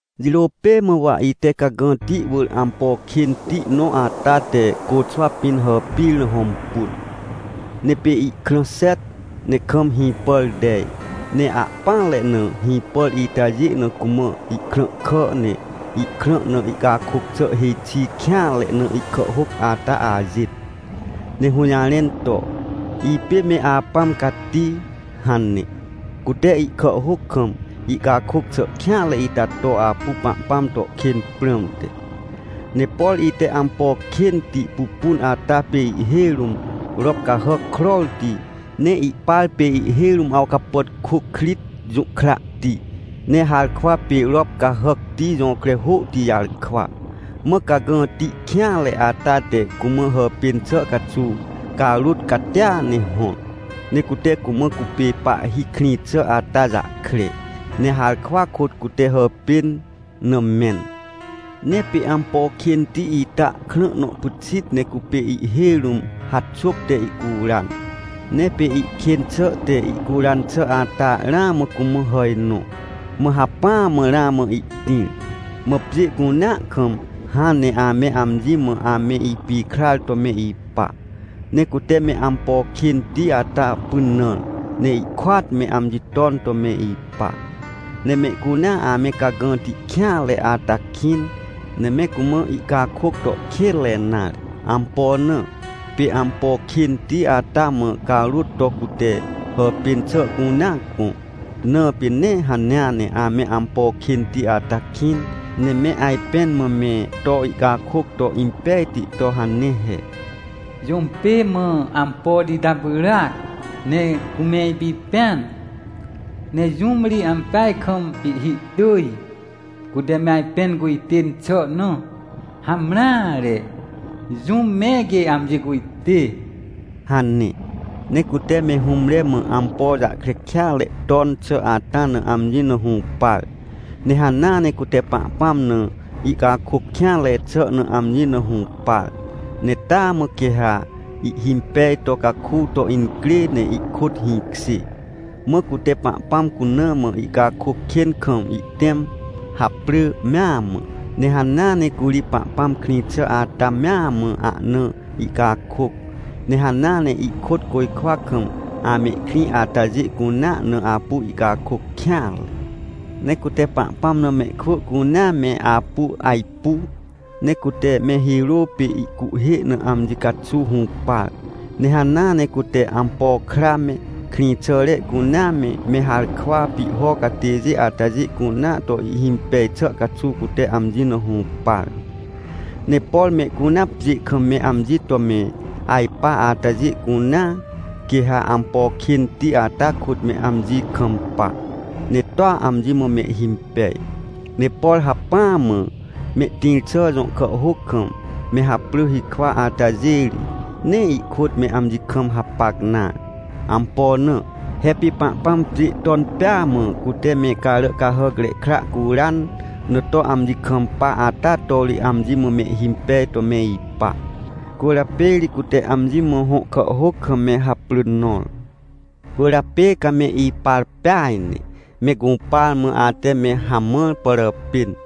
Jirô pê mã, wa ite cagãti wỳr ampo kênti nõ ata te côxwa pĩn hàpir na hõmpun. Ne pê ihkrã xet, ne kam hĩpàr tej, ne ahpỹanre na hĩpàr itajê na cumã ihkrãhkà, ne ihkrã na ihcakôc xà hêj xi kêanre na ihkàhhôc ata ajêt, ne hũjarẽn to: “Ipê Me Apãm Cati” hane. Cute ihkàhhôc kam ihcakôc xà kêanre ita to apu Pahpãm to kên prãmte. Ne por ite ampo kênti pupun ata pê ihhêj rũm rop cahàc krorti, ne ihpar pê ihhêj rũm awcapàtkôkrit jũhkrahti, ne harkwa pê rop cahàcti jõkre hôhti jarkwa. Mã cagãti kêanre ata te cumã hàpên xà caxuw carôt catia ne hõr. Ne cute cumã cupê pahhi krĩ xà ata jahkre, ne harkwa kôt cute hàpên na mẽn. Ne pê ampo kênti ita krã nõ pyxit ne cupê ihhêj rũm haxôp te ihcuran, ne pê ihkên xà te ihcuran xà ata ramã cumã hà nõ, mã hacpỹa mã ramã ihtĩr. Mã pjê cunea kam hãn ne ame amji mã ame ipikrar to me ipa, ne cute me ampo kênti ata pynãr, ne ihkôat me amji ton to me ipa. Ne mehcunea ame cagãti kêanre ata kĩn, ne me cumã ihcakôc to kênre nare. Ampo na? Pê ampo kênti ata mã carôt to cute hàpên xà cunea gõ, na pê. Ne hanea ne ame ampo kênti ata kĩn, ne me ajpẽn mã me to ihcakôc to impejti to hane he: — Jũm pê mã ampoti ita pyràac, ne cume ipipẽan? Ne jũm ri ampeaj kam ihhihtỳj, cute me ajpẽn cujtên xà na? Hamreare! Jũm me quê amji cujtê! — hane. Ne cute me hũmre mã ampo jahkre kêatre ton xà ata na amji na hũpar, ne hanea ne cute Pahpãm na ihcakôc kêanre xà na amji na hũpar, ne taa mã quê ha ihhimpej to caku to incrê ne ihkôt hĩkjê. Mã cute Pahpãm cuna mã ihcakôc kên kam ihtẽm, haprỳ mea mã, ne hanea ne curi Pahpãm krĩ xà ata mea mã ahna ihcakôc, ne hanea ne ihkôt côjkwa kam amehkrĩ atajê cunea na apu ihcakôc kêanre. Ne cute Pahpãm na mehkwỳ cunea me apu ajpu, ne cute me hirô pê ihcuhhê na amji caxuw hũpar. Ne hanea ne cute ampo kra me, krĩxàre cunea me, me harkwa pihho catêjê atajê cunea to ihhimpej xà caxuw, cute amji na hũpar. Ne por mehcunea pjê kam me amji to me ajpa atajê cunea, quê ha ampo kênti ata kôt me amji kampa, ne toa amji mã mehhimpej. Ne por hacpỹa mã mehtĩr xà jõ kàhhôc kam me haprỳ hikwa atajê ri, nee ihkôt me amji kam hapac nare. Ampo na? He pê Pahpãm pjê ton pêa mã cute me Caràcahàcre Kra curan na to amji kampa ata to ri amji mã mehhimpej to me ipa. Cwỳrjapê ri cute amji mã hõ kàhhôc kam me haprỳ nõr. Cwỳrjapê ca me ipar peaj ne, me gũpar mã ate me hamãr pàràpên.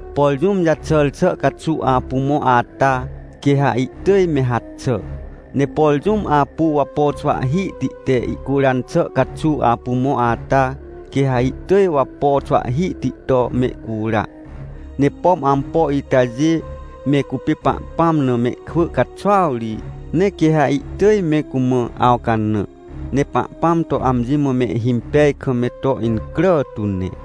Por jũm jaxàr xà caxuw apu mõ ata, quê ha ihtỳj me haxà, ne por jũm apu wapo xwahhihti te ihcuran xà caxuw apu mõ ata, quê ha ihtỳj wapo xwahhihti to mehcura. Ne pom ampo itajê, me cupê Pahpãm na mehkwỳ caxuaw ri, ne quê ha ihtỳj me cumã awcanã, ne Pahpãm to amji mã mehhimpej kam me to incrà tu ne.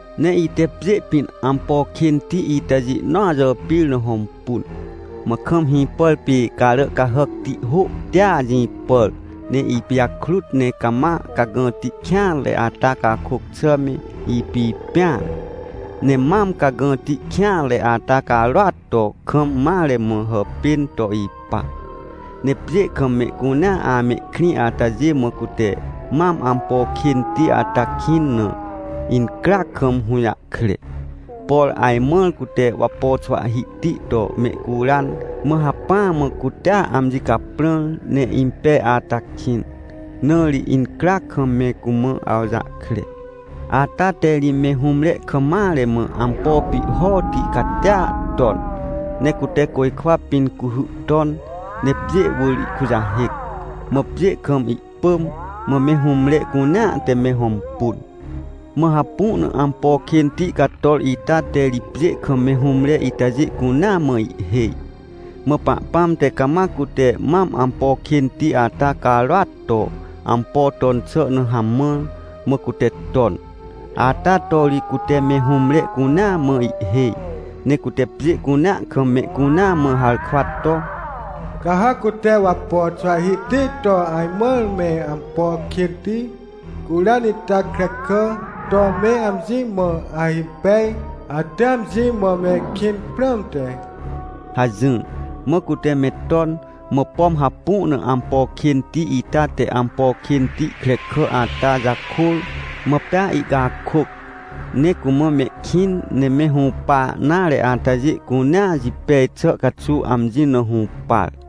Ne ite pjê pĩn ampo kênti itajê nõa jàpir na hõmpun. Mã kam hĩpàr pê carà cahàcti hôhtia jĩpàr ne ipijakrut. Ne cama cagãti kêanre ata cakôc xà me ipipẽan. Ne mam cagãti kêanre ata carôat to, kam mare mã hàpên to ipa. Ne pjê kam mehcunea amehkrĩ atajê mã cute mam ampo kênti ata kĩn na, incryac kam hũjahkre. Por ajmãr cute wapo xwahhihti to mehcuran, mã hacpỹa mã cutea amji caprãr ne impej ata kĩn, na ri incryac kam me cumã awjahkre. Ata te ri me hũmre kam mare mã ampo pihhoti catia ton. Ne cute côjkwa pĩn cuhy ton, ne pjê wỳr ihkujahêc, mã pjê kam ihpỳm. Mã me hũmre cunea te me hõmpun. Mã hapu na ampo kênti cator ita te ri pjê kam me hũmre itajê cunea mã ihhêj. Mã Pahpãm te cama cute mam ampo kênti ata carôat to ampo ton xà na hamãr, mã cute ton, ata to ri cute me hũmre cunea mã ihhêj. Ne cute pjê cunea kam mehcunea mã harkwa to: — Ca ha cute wapo xwahhihti to ajmãr me ampo kênti curan ita krekà to me amji mã ahimpej, ate amji mã mehkĩn prãmte — hajỹr. Mã cute me ton, mã pom hapu na ampo kênti ita te ampo kênti krekà ata jakôr, mã pea ihcakôc, ne cumã mehkĩn ne me hũpa nare atajê cunea jipej xà caxuw amji na hũpar.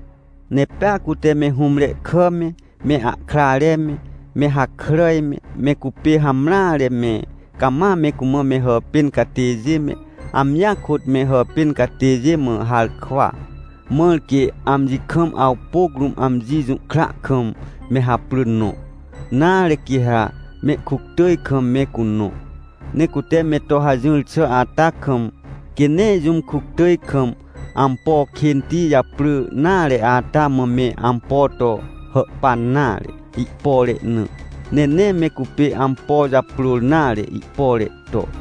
Ne pea cute me hũmre kà me, me ahkrare me, me hakràj me, me cupê hamreare me, cama me cumã me hàpên catêjê me, amjia kôt me hàpên catêjê mã harkwa, mãr quê amji kam awpôc rũm amji jũhkra kam me haprỳ nõ, nare, quê ha mehkuctỳj kam me cunõ. Ne cute me to hajỹr xà ata kam, quê nee jũm kuctỳj kam ampo kênti japrỳ nare ata mã me ampo to hàhpan nare, ihpore na. Ne nee me cupê ampo japrôr nare, ihpore to.